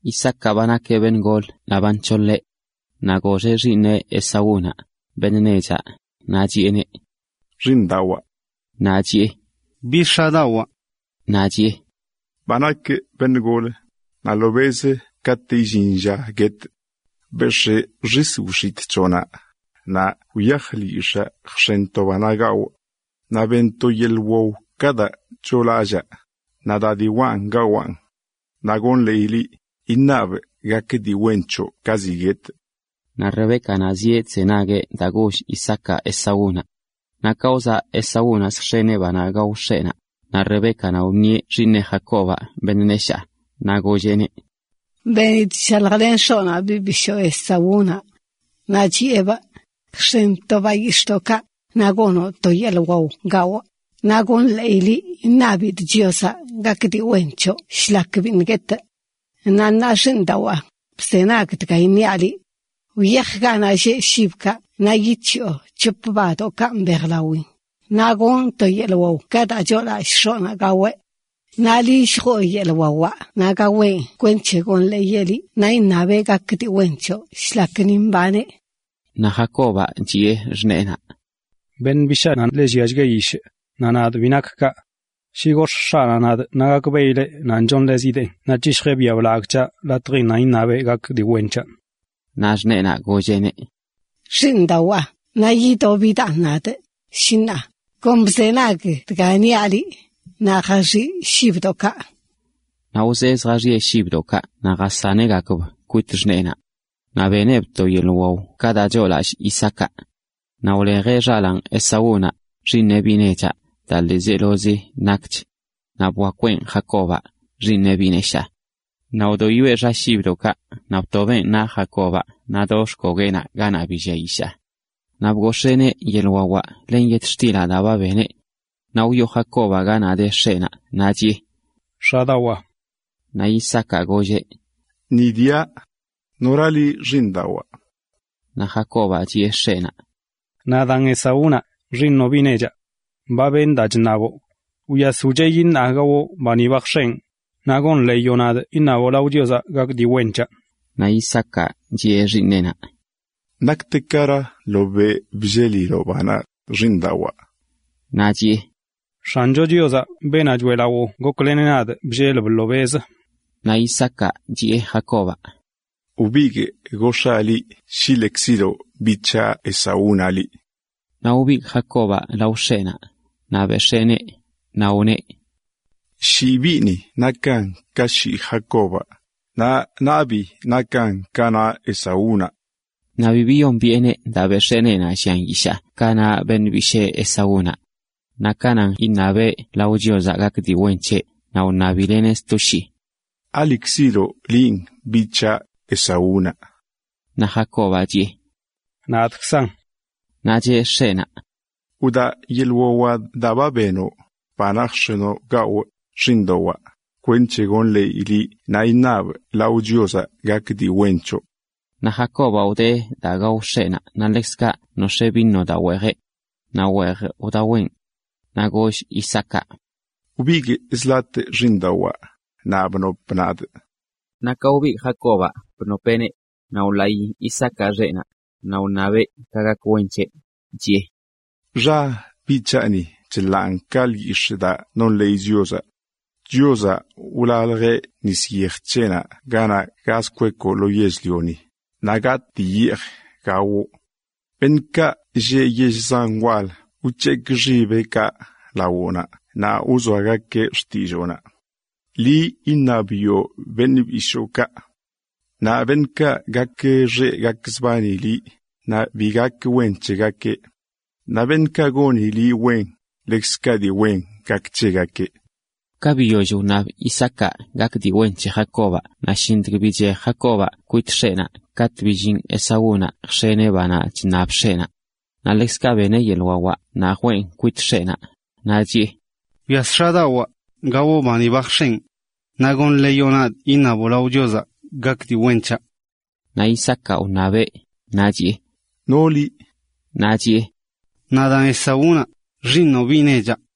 Isaacaꞌ ba nakeꞌ beṉꞌ gol naꞌ ba nc̱holeꞌ. Naꞌ goxeꞌ xiiṉeꞌ Esaúnaꞌ, beṉꞌ nechaꞌ, naꞌ chiꞌeneꞌ: ―Xiiṉdawaa. Naꞌ chiꞌe: ―¿Bi, x̱adawaa? Naꞌ chiꞌe: ―Ba nakꞌ beṉꞌ gol, naꞌ ḻobeꞌzə katꞌ illin lla guetꞌ. Bex̱ꞌ xis wix̱itꞌ c̱hoꞌnaꞌ, naꞌ wyaj lyix̱aa jx̱en to banaꞌ gawꞌ. Naꞌ ben to yeḻꞌ wao ka daa choolallaa, naꞌ da diwaꞌn gawaꞌn. Naꞌ iṉabꞌ ka gak wen c̱hoꞌ ka ziꞌ guetꞌ. Naꞌ Rebécanaꞌ zieꞌ chzenagueꞌ daa goll Isaacaꞌ Esaúnaꞌ. Naꞌ ka wzaꞌ Esaúnaꞌ zjx̱eneꞌ banaꞌ gao x̱eꞌnaꞌ, naꞌ Rebécanaꞌ wṉieꞌ xiiṉeꞌ Jacobaꞌ, beṉꞌ neshaa, naꞌ golleꞌneꞌ: ―Benidꞌ chshaljlen x̱oꞌnaꞌ biꞌ bishoo Esaúnaꞌ, naꞌ chiꞌebꞌ: “Jx̱en to bayix̱ꞌdoꞌkaꞌ, naꞌ gonoꞌ to yeḻꞌ wao gawꞌ, naꞌ iṉabidꞌ Chiozaꞌ gak dii wen c̱hoꞌ shlak biṉꞌ guetꞌ.” Naꞌ ṉaa, xiiṉdawaa, bzenag dga iṉiaꞌ liꞌ. Wyaj ganaꞌ lleꞌ shibkaꞌ naꞌ yic̱hiꞌo c̱hop badoꞌkaꞌ mbejlawin, naꞌ gonꞌ to yeḻꞌ wao ka daa choolallꞌ x̱oꞌnaꞌ gaweꞌ. Naꞌ liꞌ lljoo yeḻꞌ wawaꞌ naꞌ gaweꞌn kwenc̱he iṉabeꞌ gak dii wen c̱hoꞌ shlak ni mbaneꞌ. Naꞌ Jacobaꞌ chiꞌe xṉeenaꞌ: ―Beṉꞌ bishaanaꞌ ḻe lliachgueꞌ yishꞌ, naꞌ nadꞌ bi nakꞌ kaꞌ. Shi gox̱ꞌ x̱aꞌnaꞌ nadꞌ naꞌ gakbeꞌileꞌ nan chonḻezideen naꞌ c̱hishjeꞌ biaꞌ blagꞌ c̱haꞌ latjin nan iṉabeꞌ gak dii wen c̱haꞌ. Naꞌ xṉeenaꞌ golleꞌneꞌ: ―Xiiṉdawaa, naꞌ idobidaan nadꞌ, shi ṉaa. Kon bzenag daa niaꞌ liꞌ naꞌ jaxiꞌ shibdoꞌkaꞌ. Naꞌ wzee zjaxiꞌe shibdoꞌkaꞌ naꞌ jasaneꞌgakb kwit xṉeenaꞌ. Naꞌ beneꞌb to yeḻꞌ wao ka daa choolallꞌ Isaacaꞌ. Naꞌ wlejeꞌ xalaan Esaúnaꞌ, xiiṉeꞌ biꞌ nechaꞌ, daa ḻiizelozi nakch. Naꞌ bwakweꞌn Jacobaꞌ, xiiṉeꞌ biꞌ neshaa. Naꞌ wdoyoeꞌ xa shibdoꞌkaꞌ naꞌ btobeꞌn naꞌ Jacobaꞌ naꞌ do xkogueꞌnaꞌ ganaꞌ bi llia yishaa. Naꞌ bgox̱eeneꞌ yeḻꞌ wawaꞌ len yetxtilaꞌ daa ba beneꞌ. Naꞌ wyoo Jacobaꞌ ganaꞌ de x̱eꞌnaꞌ naꞌ chiꞌe: ―X̱adawaa. Naꞌ Isaacaꞌ golleꞌ: ―Ni diaꞌ. ¿Nora liꞌ, xiiṉdawaa? Naꞌ Jacobaꞌ chiꞌe x̱eꞌnaꞌ: ―Nadaan Esaúnaꞌ, xiiṉoꞌ biꞌ nechaꞌ. Ba benꞌ daa chṉaboꞌ. Wyas wcheꞌyi naꞌ gawoꞌ ba ni ba jx̱enꞌ, naꞌ iṉaboꞌ lao Chiozaꞌ gak dii wen c̱haꞌ. Naꞌ Isaacaꞌ chiꞌe xiiṉeꞌnaꞌ: ―¿Naktekara ḻobeꞌ blleliloꞌ banaꞌ, xiiṉdawaa? Naꞌ chiꞌe: ―X̱ancho Chiozaꞌ, beenaꞌ choeꞌlawoꞌ, gokleneꞌ nadꞌ bllelb ḻobeꞌzə. Naꞌ Isaacaꞌ chiꞌe Jacobaꞌ: ―Wbigꞌ gox̱aa liꞌ shi lekziloꞌ biꞌ c̱haꞌ Esaúnaꞌ liꞌ. Naꞌ wbigꞌ Jacobaꞌ lao x̱eꞌnaꞌ, naꞌ bex̱eeneꞌ, naꞌ wneꞌ: “Shii biꞌni nakan ka shii Jacobaꞌ, naꞌ nabii nakan ka naꞌ Esaúnaꞌ.” Naꞌ bi biyombiꞌeneꞌ daa bex̱ee neenaꞌ llian yishaa ka naꞌ beṉꞌ bishee Esaúnaꞌ. Naꞌ ka nan iṉabeꞌ lao Chiozaꞌ gak dii wen c̱heꞌ, naꞌ wṉabileꞌneꞌ sto shii: ―¿Alekziloꞌ linꞌ biꞌ c̱haꞌ, Esaúnaꞌ? Naꞌ Jacobaꞌ chiꞌe: ―Nadꞌkzan. Naꞌ cheꞌ x̱eꞌnaꞌ: ―Wdaa yeḻꞌ wawaꞌ daa benoꞌ, banaꞌ jx̱enoꞌ gawꞌ, xiiṉdawaa, kwenc̱he iṉabꞌ lao Chiozaꞌ gak dii wen c̱hoꞌ. Naꞌ Jacobaꞌ wdee daa gao x̱eꞌnaꞌ naꞌ ḻekzkaꞌ nox̱ee vino daa weejeꞌ. Naꞌ weej wdaweꞌn. Naꞌ goll Isaacaꞌ: ―Wbigꞌ zi latꞌ xiiṉdawaa, naꞌ bnop nadꞌ. Naꞌ ka wbigꞌ Jacobaꞌ bnopeꞌneꞌ, naꞌ wḻaꞌi Isaacaꞌ xeꞌnaꞌ, naꞌ wṉabeꞌ ka gak wen c̱heꞌ, chiꞌe: “Xa biꞌ c̱haꞌ ni chḻaan ka lyix̱ꞌ daa nonḻeey Chiozaꞌ. Chiozaꞌ wlaljeꞌ nis yej c̱heꞌnaꞌ ganaꞌ gaz kwekoꞌ lo yell-lioni, naꞌ gatꞌ kweꞌ dii yeej gawoꞌ. Beṉꞌkaꞌ lleꞌ yell zan wal wc̱hekꞌ xibeꞌkaꞌ lawoꞌnaꞌ naꞌ wzoagakeꞌ xtilloonaꞌ. Liꞌ iṉabiꞌo beṉꞌ bishookaꞌ. Naꞌ beṉꞌkaꞌ gakxeꞌ gakzbani liꞌ, naꞌ bi gak wen c̱hegakeꞌ. Naꞌ beṉꞌkaꞌ goni liꞌ wen, ḻekzkaꞌ dii wen gak c̱hegakeꞌ.” Naꞌ ka biyoll wṉab Isaacaꞌ gak dii wen c̱he Jacobaꞌ naꞌ shintg() bichej Jacobaꞌ kwit x̱eꞌnaꞌ, katꞌ billin Esaúnaꞌ jx̱eneꞌ banaꞌ chṉab x̱eꞌnaꞌ. Naꞌ ḻekzkaꞌ beneꞌ yeḻꞌ wawaꞌ naꞌ jween kwit x̱eꞌnaꞌ, naꞌch chiꞌe: ―Wyas x̱adawaa, gawoꞌ bani ba jx̱enꞌ. Naꞌ iṉaboꞌ lao Chiozaꞌ gak dii wen c̱haꞌ. Naꞌ Isaacaꞌ wṉabeꞌ naꞌ chiꞌe: ―¿No liꞌ(ask)? Naꞌ chiꞌe: ―Nadaan Esaúnaꞌ, xiiṉoꞌ biꞌ nechaꞌ.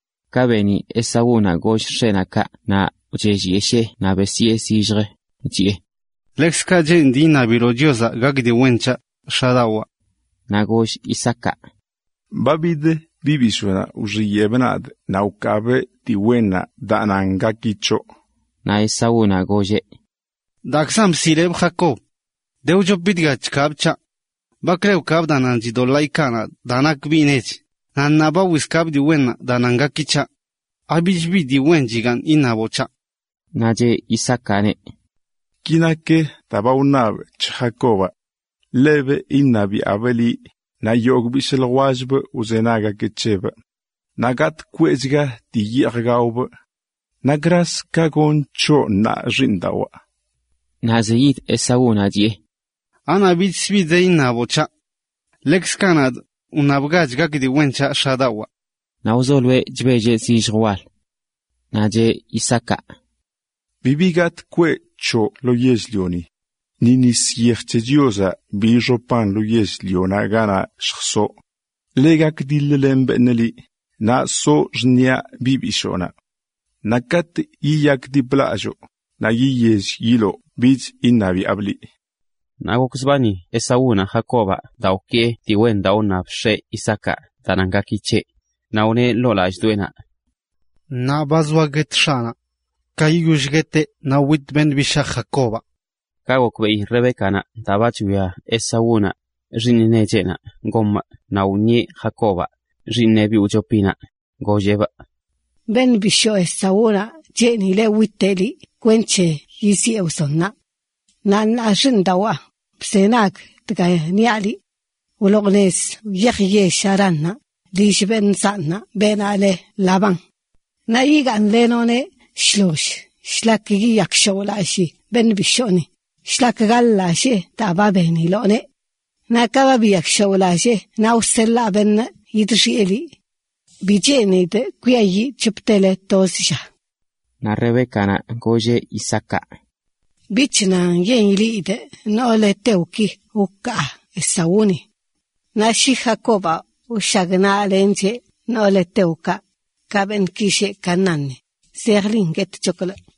Ka beni Esaú goll x̱eꞌnaꞌ kaꞌ naꞌ wchellyeshee naꞌ besyee zilljə, chiꞌe: ―Ḻekzkaꞌ cheenidꞌ iṉabiloꞌ Chiozaꞌ gak dii wen c̱haꞌ, x̱adawaa. Naꞌ goll Isaacaꞌ: ―Ba bid biꞌ bishoonaꞌ wxiyeꞌbꞌ nadꞌ naꞌ wkaabꞌ dii wennaꞌ daa nan gaki c̱hoꞌ. Naꞌ Esaúnaꞌ golleꞌ: ―Daakzan bsiꞌlebꞌ Jacob. a De wchopi dga chkaabꞌ c̱haꞌ. Bakle wkaabꞌ daa nan chidoḻaa ikaa daa nakꞌ biꞌ nech, naꞌ ṉaa ba wizkaabꞌ dii wennaꞌ daa nan gaki c̱haꞌ. ¿Abich bi dii wen chigaaṉ iṉaboꞌ c̱haꞌ? Naꞌ cheꞌ Isaacaꞌneꞌ: ―Ki nak daa ba wṉabꞌ c̱he Jacobaꞌ: ḻebꞌ iṉabiaꞌbꞌ liꞌ, naꞌ yogꞌ bishꞌ ljwellbꞌ wzenagueꞌ c̱hebꞌ. Naꞌ gatꞌ kweꞌchga dii yeej gaobꞌ. ¿Nakraz ka gonꞌ c̱hoꞌ ṉaa, xiiṉdawaa? Naꞌ zeyid Esaúnaꞌ, chiꞌe: ―¿Anaꞌ bichkzə bi de iṉaboꞌ c̱haꞌ? Ḻekzkaꞌ nadꞌ cheenidꞌ iṉaboꞌ gak dii wen c̱haꞌ, x̱adawaa. Naꞌ wzoloeꞌ chbelleꞌ zillj wal. Naꞌ cheꞌ Isaacaꞌ: “Bibi gatꞌ kweꞌ c̱hoꞌ lo yell-lioni. Ni nis yej c̱he Chiozaꞌ bi ixop lo yell-lio ganaꞌ lljsoꞌ. Ḻe gakdiḻ-len beṉꞌ liꞌ, naꞌ soꞌ xṉiꞌa biꞌ bishoonaꞌ. Naꞌ katꞌ yiyakdiplalloo, naꞌ yiyell yiloo bich iṉabiaꞌbꞌ liꞌ.” Naꞌ gokzbani Esaúnaꞌ Jacobaꞌ daa wkee dii wen daa wṉab x̱eꞌ Isaacaꞌ daa nan gaki c̱heꞌ. Naꞌ wneꞌ ḻoo lallꞌdoꞌenaꞌ: “Ṉaa ba zoa guet x̱aꞌnaꞌ. Ka yiyoll gueteꞌ naꞌ witꞌ beṉꞌ bishaa, Jacobaꞌ.” Ka gokbeꞌi Rebécanaꞌ daa ba chwia Esaúnaꞌ, xiiṉ necheꞌnaꞌ goneꞌ naꞌ wṉieꞌ Jacobaꞌ, xiiṉeꞌ biꞌ wchopinaꞌ, golleꞌneꞌ: ―Beṉꞌ bishoo Esaúnaꞌ cheenileꞌ witeꞌ liꞌ kwenc̱he yiziꞌe wzonnaꞌ. Naꞌ ṉaa xiiṉdawaa, bzenag dga iṉiaꞌ liꞌ: wloo nez wyaj yell Haránnaꞌ, lill beṉꞌ zanꞌnaꞌ beenaꞌ le Labán. Naꞌ yigaaṉlenoꞌneꞌ shloll shlak yiyakshaoꞌlallii beṉꞌ bishooni, shlak gaḻ-lallee daa ba beniloꞌneꞌ. Naꞌ ka ba biyakshaoꞌlallee naꞌ wseḻaa beṉꞌ yidxiꞌe liꞌ. Bi cheenidꞌ kwiayiꞌ c̱hoptele toz lla. Naꞌ Rebécanaꞌ golleꞌ Isaacaꞌ: ―Bich nan yen ileꞌidꞌ noolə heteoki wkaa Esaúnaꞌ. Naꞌ shi Jacobaꞌ wshagnaꞌlencheꞌ noolə heteokaꞌ, ka beṉꞌki lleꞌ Canaánni, zejlin guetchoklꞌ.